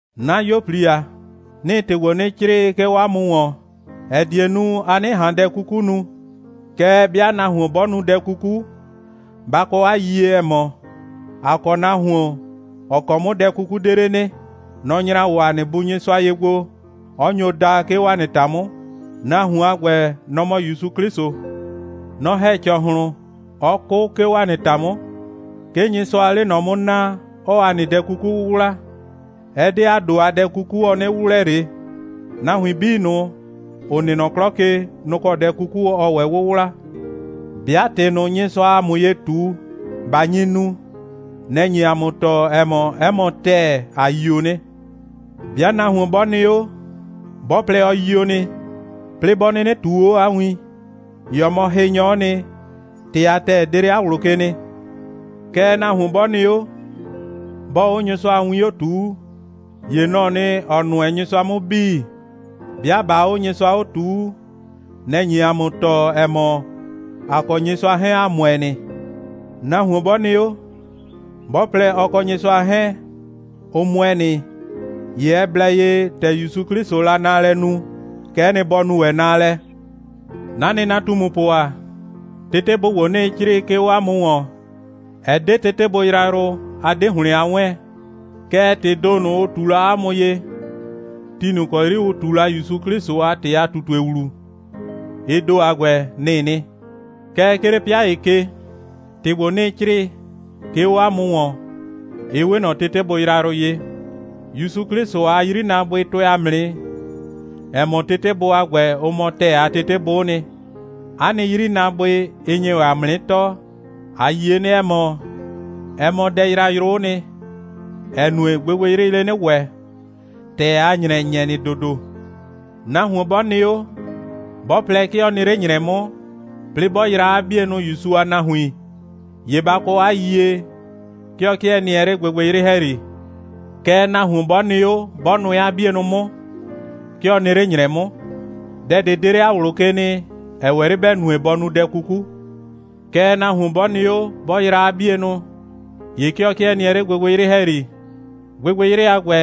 'Na 'yuo꞊pli ‑a, 'nɩɩ ‑tɩ ‑gbo 'nɩ 'crɩɩ, 'ke 'o 'a mʋ ‑wɔn, ‑ɛ die nu, a 'nɩ ꞊han dɛ 'kuku nu. Kɛɛ, 'bɩa nahuon 'bɔ nu dɛ 'kuku, ba kɔ 'a yiyie, ‑ɛ mɔ, ‑a kɔ nahuon, ‑ɔ kɔ 'mʋ dɛ 'kuku 'de 'le nɩ. Nɔ‑ nyra 'o ‑a nɩ Bu Nyɩsʋa ye gbo, 'ɔ nyo da, 'ke 'o ‑a nɩ ‑ta 'mʋ. Nahuon a ‑gbɛ, nɔ‑ mɔ ‑Yusu 'Klɩsʋ. Nɔ‑ ‑hɛ ‑cɔhlʋn, 'ɔ 'kʋ, 'ke 'o ‑a nɩ ‑ta 'mʋ. 'Ke Nyɩsʋaa 'le ꞊nɔ 'mʋ naa, 'ɔɔ ‑a nɩ dɛ 'kuku 'wʋwla. Ɛ 'de ‑a ‑do a dɛ 'kuku, ɔ 'nɩ 'wʋwlɛ ꞊le. Nahuin 'bii ꞊nʋ, ‑ʋ nɩ nɔ 'klɔ ke, nʋ‑ kɔ dɛ 'kuku ɔɔ ‑wɛ 'wʋwla. 'Bɩa ‑tɩ ꞊nʋ, Nyɩsʋaa ‑a mʋ ye ꞊tu, ꞊ba nyi nu, nɛ‑ nye ‑a mʋ tɔɔ, ‑ɛ mɔ, 'ɛ mɔ ‑tɛɛ, ‑a yio nɩ. 'Bɩa nahuon 'bɔ nɩ 'o, 'bɔ plɛ, ɔ yio nɩ, 'plɩɩ 'bɔ 'nɩnɩ ꞊tuu 'o 'a win, ‑ye ɔ mɔ hɩnyɔ'ɔ nɩ, ‑tɩ a ‑tɛɛ 'de 'le 'a ꞊wlʋ ke nɩ. Kɛɛ, nahuon 'bɔ nɩ 'o, 'bɔɔ 'o Nyɩsʋa a win 'o ꞊tuu, ‑ye nɔ‑ɔ nɩ, ‑ɔ nʋɛ Nyɩsʋa 'mʋ 'bii. 'Bɩa ꞊baa 'o Nyɩsʋa 'o ꞊tuu, nɛ‑ nye ‑a mʋ tɔɔ, ‑ɛ mɔ, ‑a kɔ Nyɩsʋa 'hɛɛn, ‑a ‑mʋɛ nɩ. Nahuon 'bɔ nɩ 'o, 'bɔ plɛ, ɔ kɔ Nyɩsʋa 'hɛɛn, ʋ ‑mʋɛ nɩ, ‑ye ɛ blɛ ye, ‑tɛ ‑Yusu 'Klɩsʋʋ la naalɛ nu, kɛ'ɛ nɩ, bɔ nu ‑wɛ naalɛ. 'Na nɩnatumupʋ ‑a, tetebʋ ‑gbo, 'nɩɩ 'crɩɩ, 'ke 'o 'a mʋ ‑wɔn, ɛ 'de tetebʋ yrayrʋ, a 'de ‑hlɩn a 'wɛɛn. Kɛɛ, ‑tɩɩ ‑do ꞊nʋ, ʋ ꞊tu la 'a mʋ ye, ti ꞊nʋ ‑kɔ 'yri ʋ ꞊tu la ‑Yusu 'Klɩsʋ a ‑tɩ a ꞊tutue ‑wlu, ɩ ‑do a ‑gbɛ, nɩ‑ɩ nɩ. Kɛɛ, 'ke 'le 'pɩa ‑ye ke, ‑tɩ ‑gbo, 'nɩɩ 'crɩɩ, 'ke 'o 'a mʋ ‑wɔn, ɩ 'we ꞊nɔ tetebʋ yrayrʋ ye. ‑Yusu 'Klɩsʋ a 'yrinaabʋɩ tʋɛ ‑a mʋ nɩ, ‑ɛ mɔ, tetebʋ a ‑gbɛ, ʋ mɔ ‑tɛɛ a tetebʋ'ʋ nɩ. 'A nɩ 'yrinaabʋɩ, ɩ nye ‑wɛ ‑a mʋ 'nɩ tɔɔ. ‑A yie nɩ, ‑ɛ mɔ, ɛ mɔ dɛ yrayrʋ'ʋ nɩ, ‑ɛ nue, gbɩgbɩyrɩɩ 'le 'nɩ ‑wɛ, ‑tɛɛ a ‑nyrɛ ‑nyɛ nɩ ‑dodo. Nahuon 'bɔ nɩ 'o, 'bɔ plɛ, 'ke ɔ nɩ 'le ‑nyrɛ 'mʋ, 'plɩɩ 'bɔ yraa 'a 'bienʋ ‑Yusu a nahuin, ‑ye ba kɔ 'a yiyie, 'ke ɔ 'kɩɛ nɩɛ 'le gbɩgbɩyrɩ ‑hɛyri. Kɛɛ, nahuon 'bɔ nɩ 'o, 'bɔ nʋɛ 'a 'bienʋ 'mʋ, 'ke ɔ nɩ 'le ‑nyrɛ 'mʋ. Dɛ ꞊de 'de 'le 'a ꞊wlʋ ke nɩ, ‑ɛ ‑wɛ 'le ‑bɛ nue, bɔ nu dɛ 'kuku. Kɛɛ, nahuon 'bɔ nɩ 'o, 'bɔ yraa 'a 'bienʋ, ‑ye 'ke ɔ 'kɩɛ nɩɛ 'le gbɩgbɩyrɩ ‑hɛyri. Gbɩgbɩyrɩ a ‑gbɛ,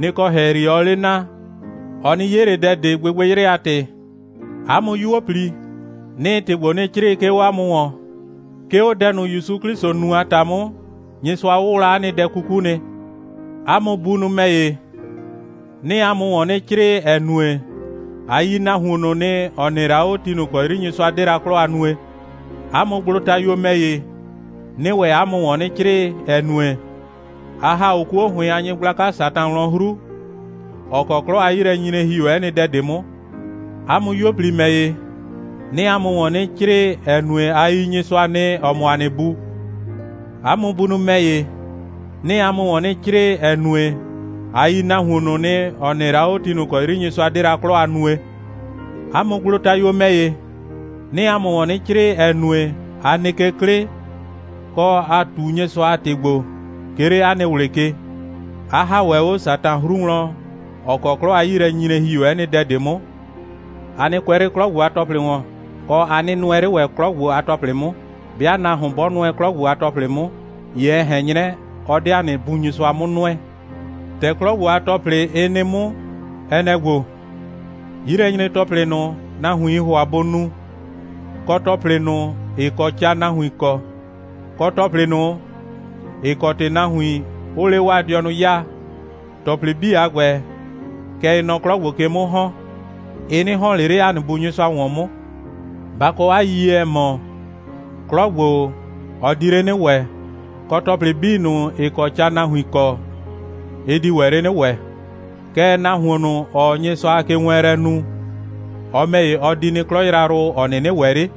nɩ‑ kɔ ‑hɛyri ɔɔ 'le na. Ɔ 'nɩ 'ye ꞊le dɛ ꞊de, gbɩgbɩyrɩ a ‑tɩ. 'A mʋ 'yuo꞊pli, 'nɩɩ ‑tɩ ‑gbo 'nɩ 'crɩɩ, 'ke 'o 'a mʋ ‑wɔn, 'ke 'o dɛ ꞊nʋ, ‑Yusu 'Klɩsʋ nu a ‑ta 'mʋ, Nyɩsʋa 'wʋwla 'a nɩ dɛ 'kuku nɩ. 'A mʋ bunʋ ‑mɛ ‑ye, 'nɩɩ 'a mʋ ‑wɔn 'nɩ 'crɩɩ, ‑ɛ nue, a yi nahuon ꞊nʋ nɩ, ‑ɔ nɩ la 'o, ti ꞊nʋ ‑kɔ 'yri Nyɩsʋa 'de la 'klɔ a nue. 'A mʋ gblotayuo ‑mɛ ‑ye, 'nɩɩ ‑wɛ 'a mʋ ‑wɔn 'nɩ 'crɩɩ, ‑ɛ nue, a ‑ha 'o 'kuo ‑hʋɩn a nyɩgblaka Satan wlɔn 'hru, ‑ɔ kɔ 'klɔ a 'yilɛnyinyre ‑hi 'o 'ɛ nɩ dɛ ꞊de 'mʋ. 'A mʋ 'yuo꞊pli ‑mɛ ‑ye, 'nɩɩ 'a mʋ ‑wɔn 'nɩ 'crɩɩ, ‑ɛ nue, a yi Nyɩsʋa nɩ, ‑ɔ mɔ ‑a nɩ Bu. 'A mʋ bunʋ ‑mɛ ‑ye, 'nɩɩ 'a mʋ ‑wɔn 'nɩ 'crɩɩ, ‑ɛ nue, a yi nahuon ꞊nʋ nɩ, ‑ɔ nɩ la 'o, ti ꞊nʋ ‑kɔ 'yri Nyɩsʋa 'de la 'klɔ a nue. 'A mʋ gblotayuo ‑mɛ ‑ye, 'nɩɩ 'a mʋ ‑wɔn 'nɩ 'crɩɩ, ‑ɛ nue, a nɩ ke 'klɩ, kɔ, 'a ꞊tu Nyɩsʋa a ‑tɩ gbo, 'ke 'le 'a nɩ ꞊wlɩ ke, 'a ‑ha ‑wɛ 'o Satan 'hru wlɔn, ‑ɔ kɔ 'klɔ a 'yilɛnyinyre ‑hi 'o 'ɛ nɩ dɛ ꞊de 'mʋ. A nɩ kʋɛ 'le 'klɔ ‑gbo a ‑tɔplɩ ‑wɔn, kɔ, a nɩ nʋɛ 'le ‑wɛ 'klɔ ‑gbo a ‑tɔplɩ 'mʋ. 'Bɩa nahuon 'bɔ nʋɛ 'klɔ ‑gbo a ‑tɔplɩ 'mʋ, ‑ye ɛ ꞊hɛn 'nyrɛ, ɔ 'de ‑a nɩ Bu Nyɩsʋa 'mʋ nʋɛ. ‑Tɛ 'klɔ ‑gbo a ‑tɔplɩ, ɩ nɩ 'mʋ, ɛ nɛ‑ ‑gbo: 'Yilɛnyre‑tɔplɩ ꞊nʋ, nahuiin ‑hʋa bʋ nu, kɔ ‑tɔplɩ ꞊nʋ, ‑ɩ kɔ ca nahuin kɔ, kɔ ‑tɔplɩ ꞊nʋ, ‑ɩ kɔ ‑tɩ nahuin, ʋʋ 'le 'waa dɩɔnʋ 'yaa, ‑tɔplɩ 'bii a ‑gbɛ, kɛ ɩɩ nɔ 'klɔ ‑gbo ke 'mʋ ‑hɔn. Ɩ 'nɩ ‑hɔn ꞊le 'le ‑a nɩ Bu Nyɩsʋa ‑wɔn 'mʋ. Ba kɔ 'a yiyie, ‑ɛ mɔ, 'klɔ ‑gbo, ɔ di 'le 'nɩ ‑wɛ, kɔ, ‑tɔplɩ 'bii ꞊nʋ, ‑ɩ kɔ ca nahuin kɔ, ɩ di ‑wɛ 'le 'nɩ ‑wɛ. Kɛɛ, nahuon ꞊nʋ, ‑ɔɔ Nyɩsʋa a kewɛɛnlɛ nu, ɔ ‑mɛ ‑ye, ɔ di nɩ 'klɔ yrayrʋ ꞊nʋ, ‑ɔ 'nɩnɩ ‑wɛ 'le.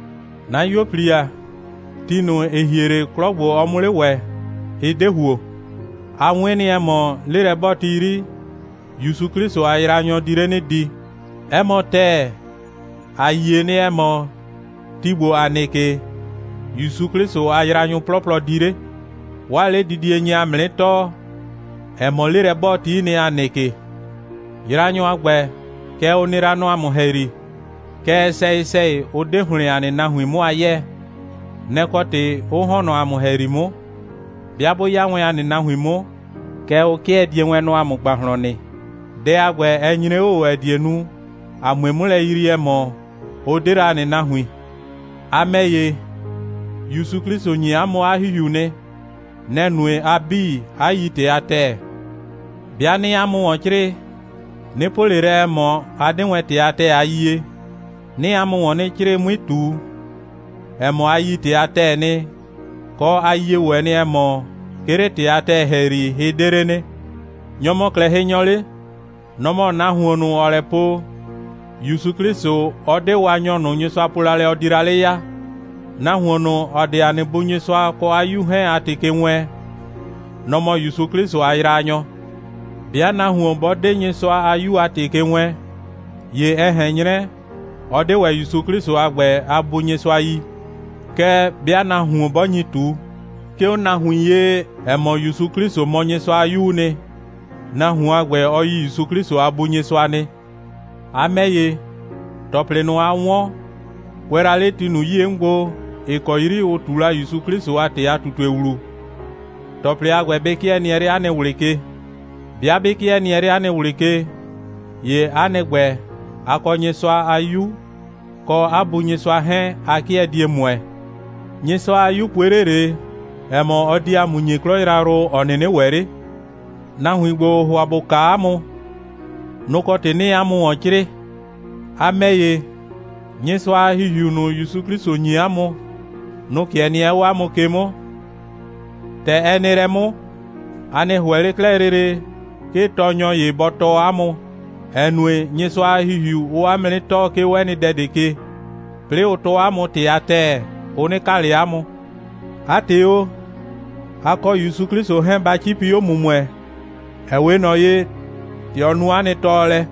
'Na 'yuo꞊pli ‑a, ti ꞊nʋ, ‑ɩ hie 'le, 'klɔ ‑gbo, ɔ 'mʋ 'le ‑wɛ, ɩ 'de ‑huo. A 'wɩn nɩ, ‑ɛ mɔ, 'lelɛ'bɔɔti 'yri, ‑Yusu 'Klɩsʋ a yraanyɔ di 'le 'nɩ di. 'Ɛ mɔ ‑tɛɛ, ‑a yie nɩ, ‑ɛ mɔ, ti ‑gbo, ‑a nɩ ke, ‑Yusu 'Klɩsʋ a yraanyʋ 'plɔplɔ di 'le. 'Waa 'ledidie nye ‑a mʋ 'nɩ tɔɔ, ‑ɛ mɔ, 'lelɛ'bɔɔti'i nɩ, ‑a nɩ ke. Yraanyʋ a ‑gbɛ, kɛ ʋ nɩ la nɔ ‑a mʋ ‑hɛyri, kɛɛ, sɛyɩ‑sɛyɩ, ʋ 'de ‑hlɩn ‑a nɩ nahuin 'mʋ a 'yɛɛ. Nɛ‑ kɔ ‑tɩ, 'ʋ ‑hɔn nɔ ‑a mʋ ‑hɛyri 'mʋ. 'Bɩa 'bʋ 'ya wɛn ‑a nɩ nahuin 'mʋ, kɛ ʋ 'kɩɛ die wɛn nɔ ‑a mʋ ‑gbahlɔn nɩ. Dɛ a ‑gbɛ, ɛ nyre 'o ꞊o, ‑ɛ die nu, ‑a 'mue 'mʋ lɛ yrii, ‑ɛ mɔ, ʋ 'de la ‑a nɩ nahuin. A ‑mɛ ‑ye, ‑Yusu 'Klɩsʋ ‑nyi 'a mʋ 'a ‑Hihiu nɩ. Nɛ‑ nue, a 'bii 'a yi ‑tɩ a ‑tɛɛ. 'Bɩa 'nɩɩ 'a mʋ ‑wɔn 'crɩɩ, 'nɩ po ꞊le lɛ, ‑ɛ mɔ, a 'de wɛn ‑tɩ a ‑tɛɛ a yie. 'Nɩɩ 'a mʋ ‑wɔn 'nɩ 'crɩɩ, 'mui ꞊tu, ‑ɛ mɔ, a yi ‑tɩ a ‑tɛɛ nɩ, kɔ, 'a yie ‑wɛ, ‑ɛ mɔ, 'ke 'le ‑tɩ a ‑tɛɛ ‑hɛyri, hɩ 'de 'le nɩ. Nyɔ‑ mɔ 'klɛɛ hɩnyɔ 'le? Nɔ‑ mɔ nahuon ꞊nʋ, ‑ɔɔ lɛ po, ‑Yusu 'Klɩsʋ, ɔ 'de Waanyɔ ꞊nʋ, Nyɩsʋa po la lɛ, ɔ di la 'le ya. Nahuon ꞊nʋ, ‑ɔ 'de ‑a nɩ Bu Nyɩsʋa kɔ 'a 'Yu 'hɛɛn a ‑tɩ ke wɛɛn, nɔ‑ mɔ ‑Yusu 'Klɩsʋ a yraanyɔ. 'Bɩa nahuon 'bɔ 'de Nyɩsʋa a 'Yu a ‑tɩ ke wɛɛn, ‑ye ɛ ꞊hɛn 'nyrɛ, ɔ 'de ‑wɛ ‑Yusu 'Klɩsʋ a ‑gbɛ a Bu Nyɩsʋa yi. Kɛɛ, 'bɩa nahuon 'bɔ nyi ꞊tu, 'ke 'o nahuin ye, ‑ɛ mɔ, ‑Yusu 'Klɩsʋ mɔ Nyɩsʋa a 'Yuu nɩ, nahuon a ‑gbɛ, ɔ yi ‑Yusu 'Klɩsʋ a Bu Nyɩsʋa nɩ. A ‑mɛ ‑ye, ‑tɔplɩ ꞊nʋ, a 'wɔn, kʋɛ la 'le ti ꞊nʋ 'yie 'mʋ gbo, ‑ɩ kɔ 'yri ʋ ꞊tu la ‑Yusu 'Klɩsʋ a ‑tɩ a ꞊tutue ‑wlu, ‑tɔplɩ a ‑gbɛ bɩ 'kɩɛ nɩɛ 'le 'a nɩ ꞊wlɩ ke. 'Bɩa 'bɩ 'kɩɛ nɩɛ 'le 'a nɩ ꞊wlɩ ke, ‑ye 'a nɩ ‑gbɛ, a kɔ Nyɩsʋa a 'Yu, kɔ 'a Bu Nyɩsʋa 'hɛɛn, a 'kɩɛ die ‑mʋɛ. Nyɩsʋa a 'Yu pue 'le ꞊le, ‑ɛ mɔ, ɔ di ‑a mʋ ‑nyi 'klɔ yrayrʋ, ‑ɔ 'nɩnɩ ‑wɛ 'le. Nahuin ‑gbo, ‑ʋʋ ‑hʋa ‑bʋ kaa 'a mʋ, nʋ‑ kɔ ‑tɩ 'nɩɩ 'a mʋ ‑wɔn 'crɩɩ. A ‑mɛ ‑ye, Nyɩsʋa a ‑Hihiu ꞊nʋ, ‑Yusu 'Klɩsʋ ‑nyi 'a mʋ, nʋ‑ 'kɩɛ nɩɛ 'o 'a mʋ ke 'mʋ. ‑Tɛ ɛ nɩ lɛ 'mʋ, a 'nɩ ‑hʋɛ ꞊le 'klɛɛ lele, 'ke tɔɔnyɔ ‑ye bɔ tɔɔ 'a mʋ, ‑ɛ nue, Nyɩsʋa a ‑Hihiu, ʋʋ 'a mʋ 'nɩ tɔɔ, 'ke 'o 'ɛ nɩ dɛ ꞊de ke, 'plɩɩ, ʋʋ tɔɔ 'a mʋ ‑tɩ a ‑tɛɛ, ʋ 'nɩ kaa ꞊le 'a mʋ. 'A ‑tɩ o, a kɔ ‑Yusu 'Klɩsʋ 'hɛɛn, ba 'cipi 'o ‑mʋmʋɛ, ‑ɛ 'we ꞊nɔ ye, ‑tɛ ɔ nu 'a nɩ tɔɔlɛ.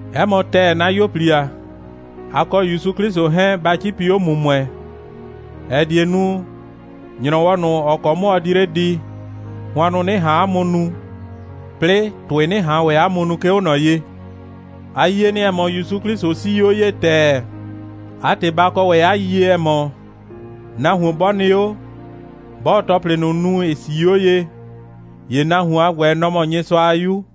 'Ɛ mɔ ‑tɛɛ, 'na 'yuo꞊pli ‑a, a kɔ ‑Yusu 'Klɩsʋ 'hɛɛn, ba 'cipi 'o ‑mʋmʋɛ, ‑ɛ die nu, ‑nyrɔwɔ ꞊nʋ, ‑ɔ kɔ 'mʋ ɔ di 'le di, hʋannʋ 'nɩ ꞊han ‑a mʋ nu, 'plɩɩ ‑tʋɩ 'nɩ ꞊han ‑wɛ ‑a mʋ nu, 'ke 'o ꞊nɔ ye. A yie nɩ, ‑ɛ mɔ, ‑Yusu 'Klɩsʋ 'sii 'o ye ‑tɛɛ. 'A ‑tɩ, ba kɔ ‑wɛ 'a yiyie, ‑ɛ mɔ, nahuon 'bɔ nɩ 'o, 'bɔɔ ‑tɔplɩ ꞊nʋ nu, ‑ɩ 'sii 'o ye, ‑ye nahuon a ‑gbɛ, nɔ‑ mɔ Nyɩsʋa a 'yu.